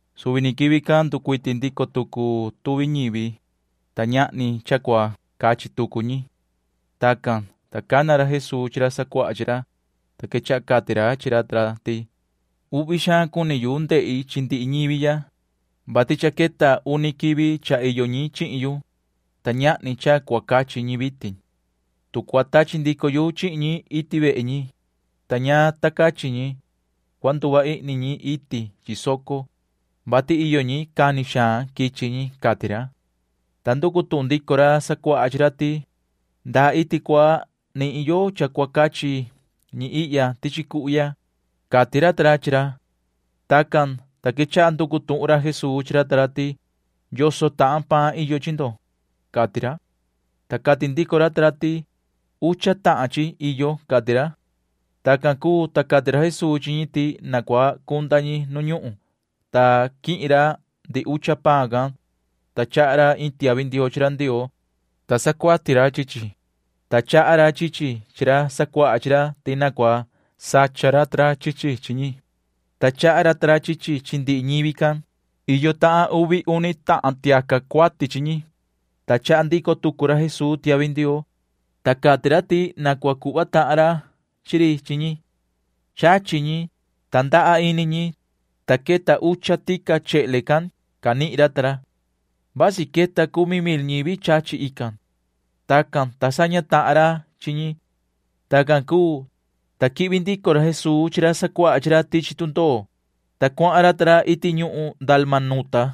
Suvi ni quivi can nducuiti ndico tucu tuvi ñivi, ta ñahni cha cua cachi tucu ñi. Tacan, ta cana ra Jesuu chi ra sacuaha chi ra, ta quechaha cati ra chi ra ta ra ti: ―Uhvi xaan cuni yu ndehi chi ndihi ñivi ya, vati cha queta uni quivi cha iyo ñi chihin yu, ta ñahni cha cua cachi ñi vitin. Tu cua tachi ndico yu chihin ñi iti vehe ñi, ta ña ta cachi ñi, cua nduva ihni ñi iti chi soco, vati iyo ñi cani xaan quichi ñi ―cati ra. Ta nducu tuhun ndico ra sacuaha chi ra ti: ―¿Ndaa iti cua nihin yo cha cua cachi ñi ihya tichi cuhu ya? ―cati ra ta ra chi ra. Tacan, ta quechaha nducu tuhun ra Jesuu chi ra ta ra ti: ―¿Yoso tahan paan iyo chi ndo? ―cati ra. Ta cati ndico ra ta ra ti: ―Ucha tahan chi iyo ―cati ra. Tacan cuu, ta cati ra Jesuu chi ñi ti na cua cunda ñi nu ñuhun, ta quihin ra ndihi ucha paan can, ta chaha ra iin tiahvi ndioo chi ra Ndioo, ta sacuati ra chi chi, ta chaha ra chi chi chi ra sacuaha chi ra ti na cua sacha ra ta ra chi chi chi ñi, ta chaha ra ta ra chi chi chi ndihi ñivi can. Iyo tahan uvi uni tahan tiaca cuati chi ñi, ta chaha ndico tucu ra Jesuu tiahvi ndioo, ta cati ra ti na cua cuhva tahan ra chi ri chi ñi. Chachi ñi, ta ndaha ini ñi, ta queta ucha tica chehle can canihin ra ta ra. Vasi queta cumi mil ñivi chachi ican. Tacan, ta saña tahan ra chi ñi. Tacan cuu, ta quihvi ndico ra Jesuu chi ra sacuaha chi ra tichi tundoo, ta cuahan ra ta ra iti ñuhun Dalmanuta.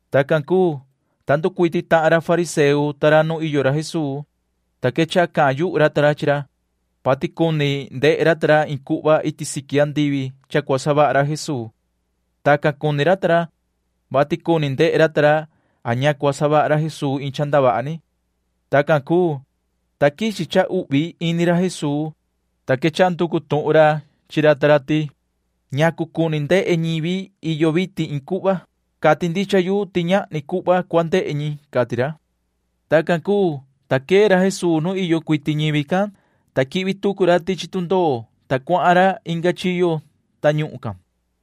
Tacan cuu, ta nducuiti tahan ra fariseo ta ra nu iyo ra Jesuu, ta quechaha cahan yuhu ra ta ra chi ra, vati cuni ndehe ra ta ra iin cuhva iti siqui andivi cha cua savaha ra Jesuu. Tacan cuni ra ta ra, vati cuni ndehe ra ta ra a ña cua savaha ra Jesuu iin cha ndavaha ni. Tacan cuu, ta quichi cha uhvi ini ra Jesuu, ta quechaha nducu tuhun ra chi ra ta ra ti: ―¿Ñacu cuni ndehe ñivi iyo vitin iin cuhva? Cati ndicha yu ti ñahni cuhva cua ndehe ñi ―cati ra. Tacan cuu, ta quee ra Jesuu nu iyo cuiti ñivi can, ta quihvi tucu ra tichi tundoo, ta cuahan ra inga chiyo tañuhun can.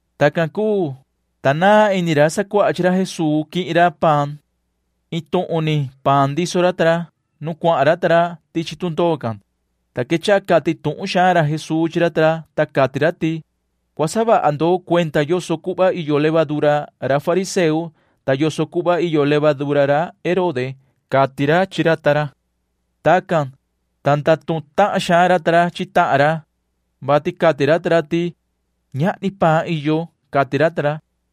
Tacan cuu, ta naan ini ra sacuaha chi ra Jesuu quihin ra paan. Iin tuhun ni paan ndiso ra ta ra nu cuahan ra ta ra tichi tundoo can, ta quechaha cati tuhun xaan ra Jesuu chi ra ta ra, ta cati ra ti: ―Cua saha vaha ndo cuenda yoso cuhva iyo levadura ra fariseo ta yoso cuhva iyo levadura ra Herode ―cati ra chi ra ta ra. Tacan, ta ndatuhun tahan xaan ra ta ra chi tahan ra, vati cati ra ta ra ti: ―Ñahni paan iyo ―cati ra ta ra.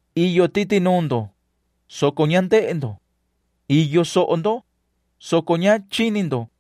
Iyo titi nuun ndo, soco ña ndehe ndo. Iyo soho ndo, soco ña chini ndo.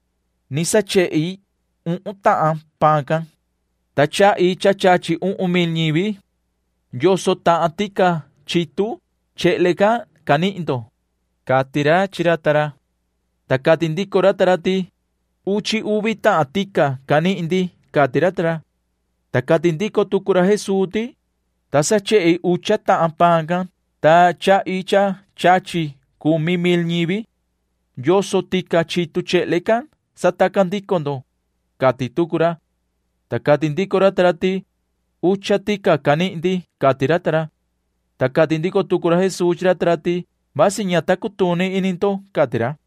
ni sachehi uhun tahan paan can, ta chahi cha chachi uhun mil ñivi. ¿Yoso tahan tica chitu chehle can canihin ndo? ―cati ra chi ra ta ra. Ta cati ndico ra ta ra ti: ―Uchi uvi tahan tica canihin ndi ―cati ra ta ra. Ta cati ndico tucu ra Jesuu ti: ―Ta sachehi ucha tahan paan can, ta chahi cha chachi cumi mil ñivi. ¿Yoso tica chitu chehle can sataca ndico ndo? ―cati tucu ra. Ta cati ndico ra ta ra ti: ―Ucha tica canihin ndi ―cati ra ta ra. Ta cati ndico tucu ra Jesuu chi ra ta ra ti: ―Vasi ña ta cutuni ini ndo ―cati ra.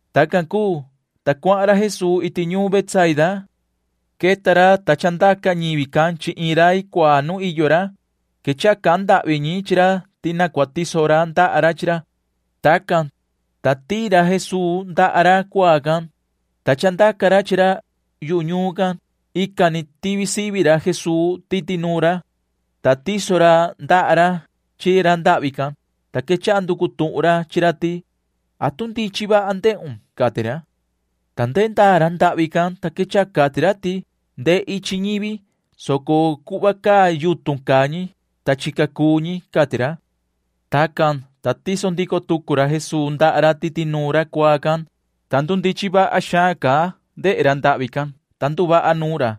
Tacan cuu, ta cuahan ra Jesuu iti ñuun Betsaida. Queta ra, ta chandaca ñivi can chi iin rai cuaa nu iyo ra. Quechaha cahan ndahvi ñi chi ra ti na cua tiso ra ndaha ra chi ra. Tacan, ta tiin ra Jesuu ndaha ra cuaa can, ta chandaca ra chi ra yu ñuun can. Ican ni tivi sivi ra Jesuu titi nuun ra, ta tiso ra ndaha ra chi ra ndahvi can, ta quechaha nducu tuhun ra chi ra ti: ―¿Atu ndichin vaha ndehun? ―cati ra. Ndehe ndaa ra ndahvi can, ta quechaha cati ra ti: ―Ndehi chi ñivi, soco cuhva caa yutun caa ñi, ta chica cuu ñi ―cati ra. Tacan, ta tiso ndico tucu ra Jesuu ndaha ra titi nuun ra cuaa can, ta nihin xaan ndehe ra ndahvi can, ta nduvaha nuun ra.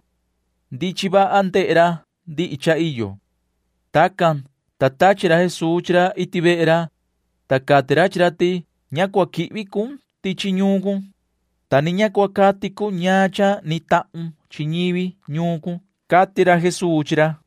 Ndichin vaha ndehe ra ndihi cha iyo. Tacan, ta tachi ra Jesuu chi ra iti vehe ra, ta cati ra chi ra ti: ―Ña cua quihvi cun tichi ñuun cun, ta ni ña cua cati cun ñaan cha ni tahun chi ñivi ñuun cun ―cati ra Jesuu chi ra.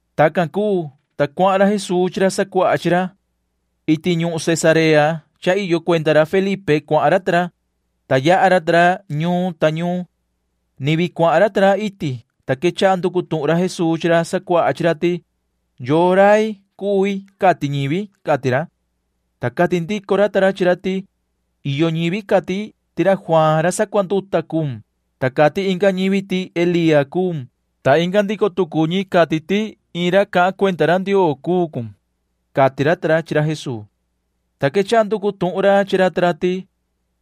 Tacan cuu, ta cuahan ra Jesuu chi ra sacuaha chi ra. Iti ñuhun Cesarea cha iyo cuenda ra Felipe cuahan ra ta ra, ta yaha ra ta ra ñuun ta ñuun. Ni vii cuahan ra ta ra iti, ta quechaha nducu tuhun ra Jesuu chi ra sacuaha chi ra ti: ―¿Yoo rai cui cati ñivi? ―cati ra. Ta cati ndico ra ta ra chi ra ti: ―Iyo ñivi cati ti ra Juaan ra sacuanduta cuun, ta cati inga ñivi ti Elía cuun, ta inga ndico tucu ñi cati ti iin ra cahan cuenda ra Ndioo cuu cun ―cati ra ta ra chi ra Jesuu. Ta quechaha nducu tuhun ra chi ra ta ra ti: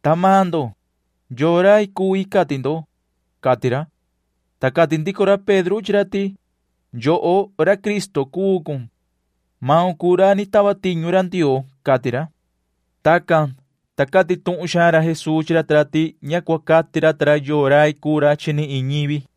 ―Ta maan ndo, ¿yoo rai cui cati ndo? ―cati ra. Ta cati ndico ra Pedro chi ra ti: ―Yoho ra Cristo cuu cun. Maun cuu ra ni tava tiñu ra Ndioo ―cati ra. Tacan, ta cati tuhun xaan ra Jesuu chi ra ta ra ti ña cua cati ra ta ra yoo rai cuu ra ni chi iin ñivi.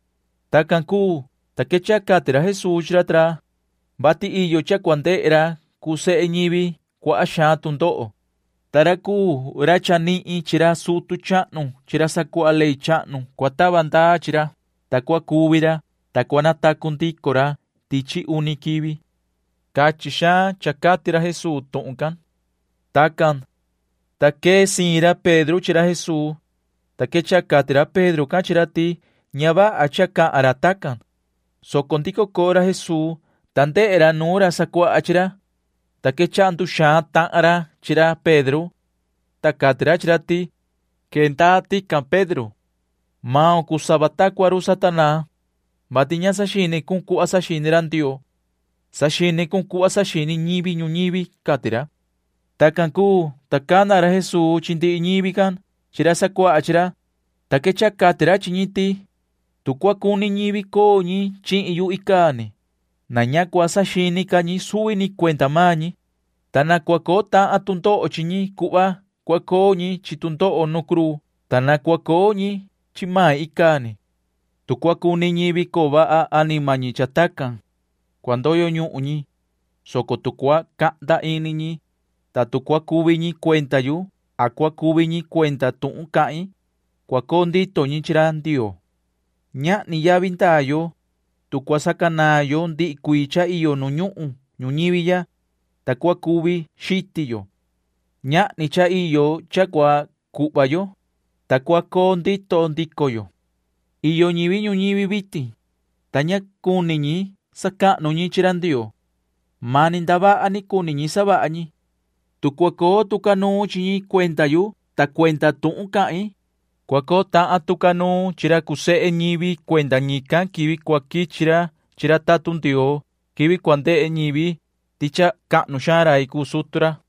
Tacan cuu, ta quechaha cati ra Jesuu chi ra ta ra, vati iyo cha cua ndehe ra cuu sehe ñivi cuaha xaan tu ndoho, ta ra cuu ra chanihin chi ra sutu chahnu chi ra sacuaha ley chahnu cua tava ndaa chi ra, ta cua cuvi ra, ta cua natacu ndico ra tichi uni quivi. Cachin xaan cha cati ra Jesuu tuhun can. Tacan, ta quee siin ra Pedro chi ra Jesuu, ta quechaha cati ra Pedro can chi ra ti ña vaha cha cahan ra tacan, soco ndico coo ra Jesuu, ta ndehe ra nuun ra sacuaha chi ra, ta quechaha nduxaan tahan ra chi ra Pedro. Cati ra chi ra ti: ―Cha cua queun, yoho Pedro. Maun cuu sava ta cua run Satanaa, vati ña saxini cun cuhva saxini ra Ndioo. Saxini cun cuhva saxini ñivi ñuñivi ―cati ra. Tacan cuu, ta cana ra Jesuu chi ndihi ñivi can chi ra sacuaha chi ra, ta quechaha cati ra chi ñi ti: ―Tu cua cuni ñivi coo ñi chihin yu icaa ni, na ña cua saxini ca ñi suvi ni cuenda maan ñi, ta na cua coo tahan tu ndoho chi ñi cuhva cua coo ñi chi tu ndoho nu cruu, ta na cua coo ñi chi main icaa ni. Tu cua cuni ñivi coo vaha anima ñi cha tacan, cua ndoyo ñuhun ñi, soco tu cua cahnda ini ñi, ta tu cua cuvi ñi cuenda yu a cua cuvi ñi cuenda tuhun cahin, cua coo ndito ñi chi ra Ndioo. Ñahni yavi ndaa yo, tu cua sacanaan yo ndihi cuii cha iyo nu ñuhun ñuñivi ya, ta cua cuvi xiti yo. Ñahni cha iyo cha cua cuhva yo, ta cua coo ndito ndico yo. Iyo ñivi ñuñivi vitin, ta ña cuni ñi sacahnu ñi chi ra Ndioo. Mani ndavaha ni cuni ñi savaha ñi. Tu cua coo tu ca nuun chi ñi cuenda yu ta cuenda tuhun cahin, cua coo tahan tu ca nuun chi ra cuu sehe ñivi cuenda ñican quivi cua quichi ra chi ra tatun Ndioo quivi cua ndehe ñivi ti cha cahnu xaan rai cuu sutu ra.